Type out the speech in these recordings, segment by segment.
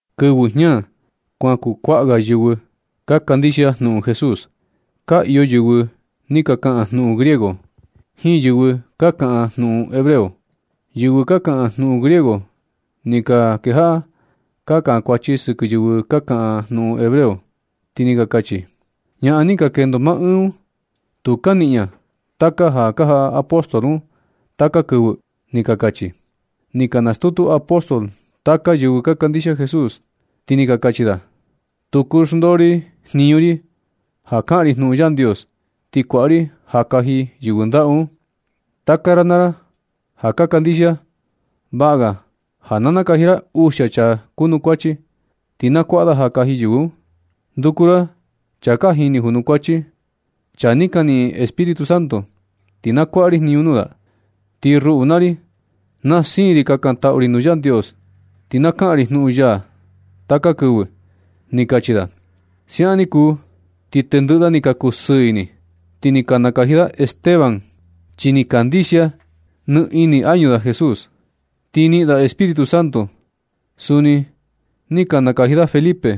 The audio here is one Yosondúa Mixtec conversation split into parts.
Kɨvɨ jña kuan kukuaꞌa ga yɨvɨ ka kandixia jnuꞌun Jesús. Ka iyo yɨvɨ ni ka kaꞌan jnuꞌun griego, jiin yɨvɨ ka kaꞌan jnuꞌun hebreo. Yɨvɨ ka kaꞌan jnuꞌun griego ni ka kejaꞌa ka kankuachi sɨkɨ yɨvɨ ka kaꞌan jnuꞌun hebreo, ti ni ka kachi: ―Ñaꞌan ni ka jiꞌi yɨɨ un, tu ka niꞌin ña taka ja ka jaꞌa apóstol un taka kɨvɨ ―ni ka kachi. Ni ka nastutu apóstol taka yɨvɨ ka kandixia Jesús, ti ni ka kachi da: ―Tu kuu xndoo ri jniñu ri ja ka kaꞌan ri jnuꞌun Yandios, ti kuaꞌa ri ja kaji yɨvɨ ndaꞌu un. Taka ra naa ra ja ka kandixia, vaꞌa ga ja na nakaji ra uxia chaa kunukuachi, ti na kuaꞌa da ja kaji yɨvɨ un. Nduku ra chaa ka jini junukuachi, chaa ni ka niꞌin Espíritu Santo, ti na kuaꞌa ri jniñu nuu da. Ti ruꞌu naa ri, na siin ri kakantaꞌu ri nuu Yandios, ti na kaꞌan ri jnuꞌun ya taka kɨvɨ ―ni kachi da. Siaꞌan ni kuu, ti tendɨꞌɨ da ni ka kusɨɨ ini. Ti ni ka nakaji da Esteban, chi ni kandixia nɨ ini añu da Jesús, ti ni niꞌin da Espíritu Santo. Suni ni ka nakaji da Felipe,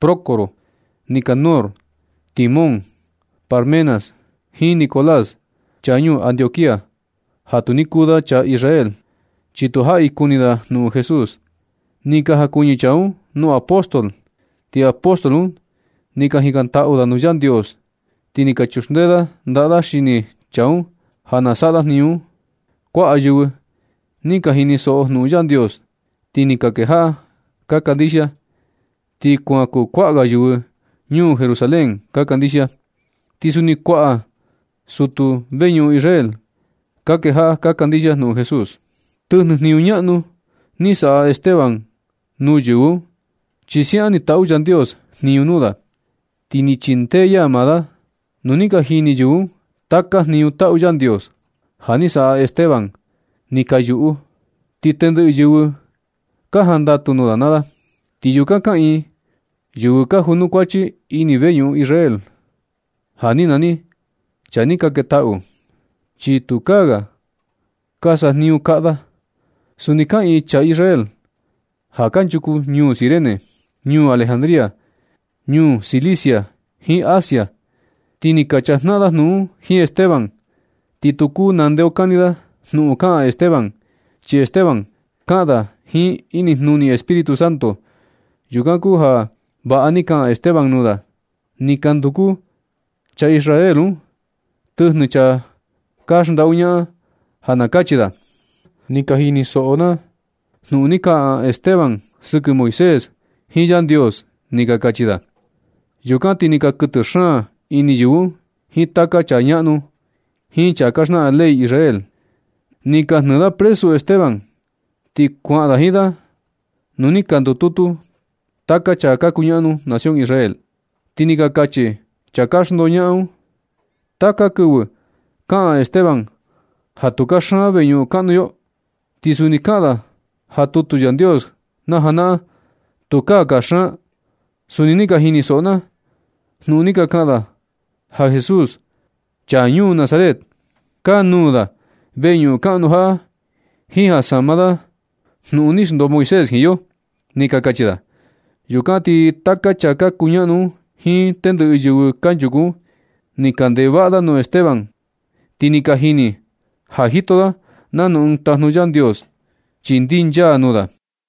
Prócoro, Nikanor, Timón, Parmenas jiin Nicolás, chaa ñuu Antioquía, ja tu ni kuu da chaa Israel, chi tu jaꞌi kuni da jnuꞌun Jesús. Ni ka jakuɨñɨ chaa un nuu apóstol, ti apóstol un ni ka jikantaꞌu da nuu Yandios. Ti ni ka chuxndee da ndaꞌa da xini chaa un ja na saꞌa da jniñu un. Kuaꞌa yɨvɨ ni ka jinisoꞌo jnuꞌun Yandios, ti ni ka kejaꞌa ka kandixia, ti kuan kukuaꞌa ga yɨvɨ ñuu Jerusalén ka kandixia. Ti suni kuaꞌa sutu veñuꞌun Israel ka kejaꞌa ka kandixia jnuꞌun Jesús. Tɨjnɨ jniñu ñaꞌnu ni saꞌa Esteban nuu yɨvɨ un, chi siaꞌan ni taꞌu Yandios jniñu nuu da, ti ni chindee ya maa da. Nu ni ka jini yɨvɨ un taka jniñu taꞌu Yandios ja ni saꞌa Esteban, ni ka yuꞌu. Ti tendɨꞌɨ yɨvɨ ka jandatu nuu da naa da. Ti yukan kaꞌiin yɨvɨ ka junukuachi ini veñuꞌun Israel ja ni nani “Chaa ni ka ketaꞌu”, chi tukaa ga ka sajniñu kaꞌa da. Suni kaꞌiin chaa Israel ja kanchuku ñuu Cirene, ñuu Alejandría, ñuu Cilicia jiin Asia. Ti ni ka chajnaꞌan da jnuꞌun jiin Esteban. Ti tu kuu nandeokani da jnuꞌun kaꞌan Esteban, chi Esteban kaꞌan da jiin inijnuni Espíritu Santo. Yukan kuu ja vaꞌa ni kaꞌan Esteban nuu da. Ni ka nduku chaa Israel un tɨjnɨ chaa ka xndaꞌu ñaꞌan ja na kachi da: ―Ni ka jinisoꞌo na jnuꞌun ni kaꞌan Esteban sɨkɨ Moisés jiin Yandios ―ni ka kachi da. Yukan ti ni ka kuɨtɨ xaan ini yɨvɨ un jiin taka chaa ñaꞌnu, jiin chaa ka xnaꞌan ley Israel. Ni ka jnɨɨ da presu Esteban, ti kuaꞌan da jiin da nuu ni ka ndututu taka chaa ka kuñaꞌnu nación Israel. Ti ni ka kachi chaa ka xndoñaꞌan un: ―Taka kɨvɨ kaꞌan Esteban ja tu kaxan veñuꞌun kaꞌnu yo, ti suni kaꞌan da ja tutu Yandios najanaꞌan, tukaa kaxan. Suni ni ka jinisoꞌo na jnuꞌun ni ka kaꞌan da ja Jesús, chaa ñuu Nazaret, kanuū da veñuꞌun kaꞌnu jaꞌa, jiin ja sama da jnuꞌun ni xndoo Moisés jiin yo ―ni ka kachi da. Yukan ti taka chaa ka kuñaꞌnu un jiin tendɨꞌɨ yɨvɨ kanchuku un, ni ka ndeꞌe vaꞌa nuu Esteban. Ti ni ka jini ja jito da nanu ɨɨn tajnu Yandios, chi ndinchaa nuu da.